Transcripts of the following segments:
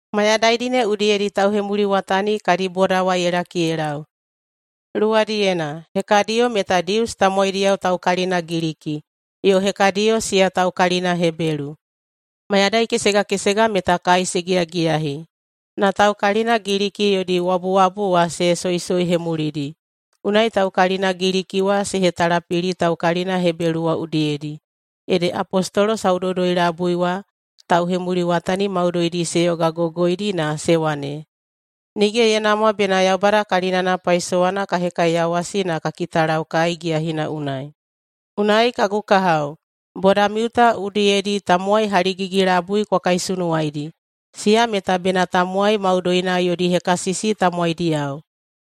Mayadaidi ne udiyedi tauhemuliwatani kadi boda wa ye laki ye lau. Luwadiyena, hekadiyo meta Dius tamowaidiyao taukalina Giliki, yo hekadiyo siya taukalina Hebelu. Mayadai kesega kesega meta kai se giyagiyahi, na taukalina Giliki yodi wabuwabu wa se soisoihemulidi. Unai taukalina Giliki wa se hetalapili taukalina Hebelu wa udiyedi. Ede apostolo saudoudoi-labui wa tauhemuliwatani maudoidi se yogagogoidi na se wane, “Nige ye namwa bena Yaubada kalinana paisowana ka hekaiyawasi na ka kitalau kai giyahina unai. Unai, kagu kahao, bodamiu ta udiyedi tamowai haligigi-labui kwa kaisunuwaidi, siya meta bena tamowai maudoina yodi hekasisi tamowaidiyao,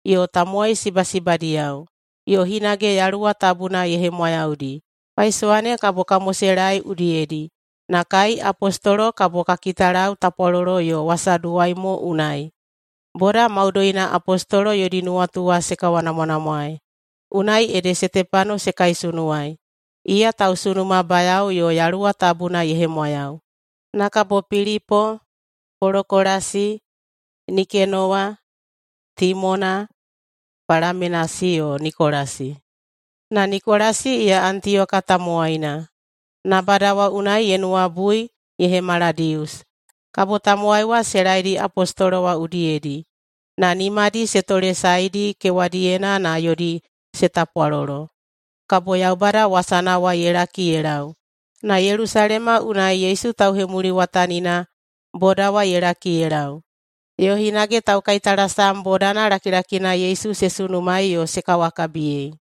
yo tamowai sibasibadiyao, yo hinage Yaluwa Tabuna ye hemwayaudi. Paisowa ne kabo ka moselaei udiyedi, na kai apostolo kabo ka kitalau tapwalolo yo wasaduwai mo unai.” Boda maudoina apostolo yodi nuwatu wa se kawanamwanamwaei. Unai ede Setepano se kaisunuwaei, iya tausunumabayao yo Yaluwa Tabuna ye hemwayau. Na kabo Pilipo, Polokolasi, Nikenowa, Timona, Palamenasi, yo Nikolasi. Na Nikolasi iya Antiyoka tamowaina nabada wa unai ye nuwabui ye hemala Dius. Kabo tamowai wa se laedi apostolo wa udiyedi, na nimadi se tolesaedi kewadiyena na yodi se tapwalolo. Kabo Yaubada wasana wa ye laki ye lau, na Yelusalema unai Yesu tauhemuliwatanina boda wa ye laki ye lau, yo hinage taukaitalasam bodana lakilakina Yesu se sunumaei yo se kawakabiyei.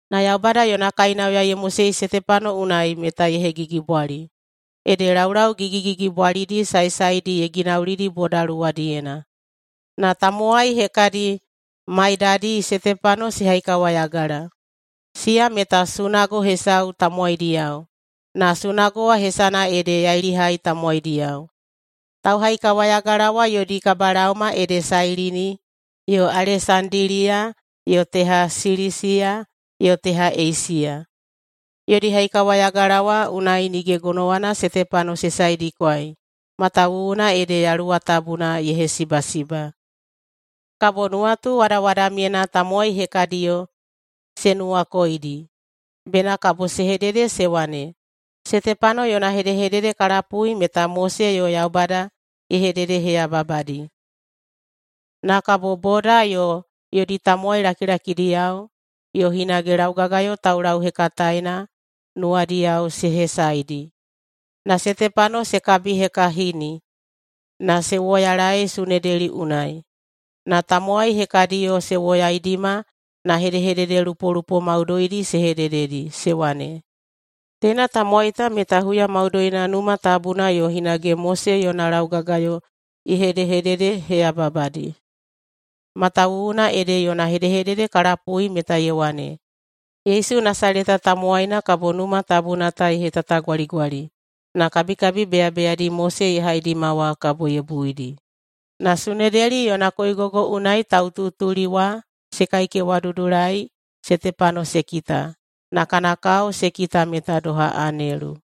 Na Yaubada yona kainauya ye mosei Setepano unai meta ye hegigibwali, ede laulau gigigigibwalidi saesaedi ye ginaulidi boda luwadiyena. Na tamowai hekadi maidadi Setepano se haikawayagala, siya meta sunago hesau tamowaidiyao, na sunago wa hesana ede “Yailihai Tamowaidiyao”. Tauhaikawayagala wa yodi kabalaoma ede Sailini yo Alesandiliya yo teha Silisiya yo teha Eisiya. Yodi haikawayagala wa unai nige gonowana Setepano se saedikwai matawuwuna ede Yaluwa Tabuna ye hesibasiba. Kabo nuwatuwadawadamyena tamowai hekadiyo se nuwakoidi bena kabo se hedede se wane, “Setepano yona hedehedede ka lapui meta Mose yo Yaubada ye hededeheyababadi.” Na kabo boda yo yodi tamowai lakilakidiyao, yo hinage laugagayo taulauhekataena nuwadiyao se hesaedi, na Setepano se kabihekahini na se woyalaei Sunedeli unai. Na tamowai hekadiyo se woyaidima na hedehededelupolupo maudoidi se hedededi, se wane, “Teina tamowai ta meta huya maudoina Numa Tabuna yo hinage Mose yona laugagayo ye hedehededeheyababadi. Matawuwuna ede yona hedehedede ka lapui meta ye wane, Yesu Nasaleta tamowaina kabo Numa Tabuna ta ye hetatagwaligwali na kabikabi beyabeyadi Mose ye haidima wa kabo ye buidi.” Na Sunedeli yona koigogo unai taututuli wa se kaikewadudulai Setepano se kita, na kana kao se kita meta doha anelu.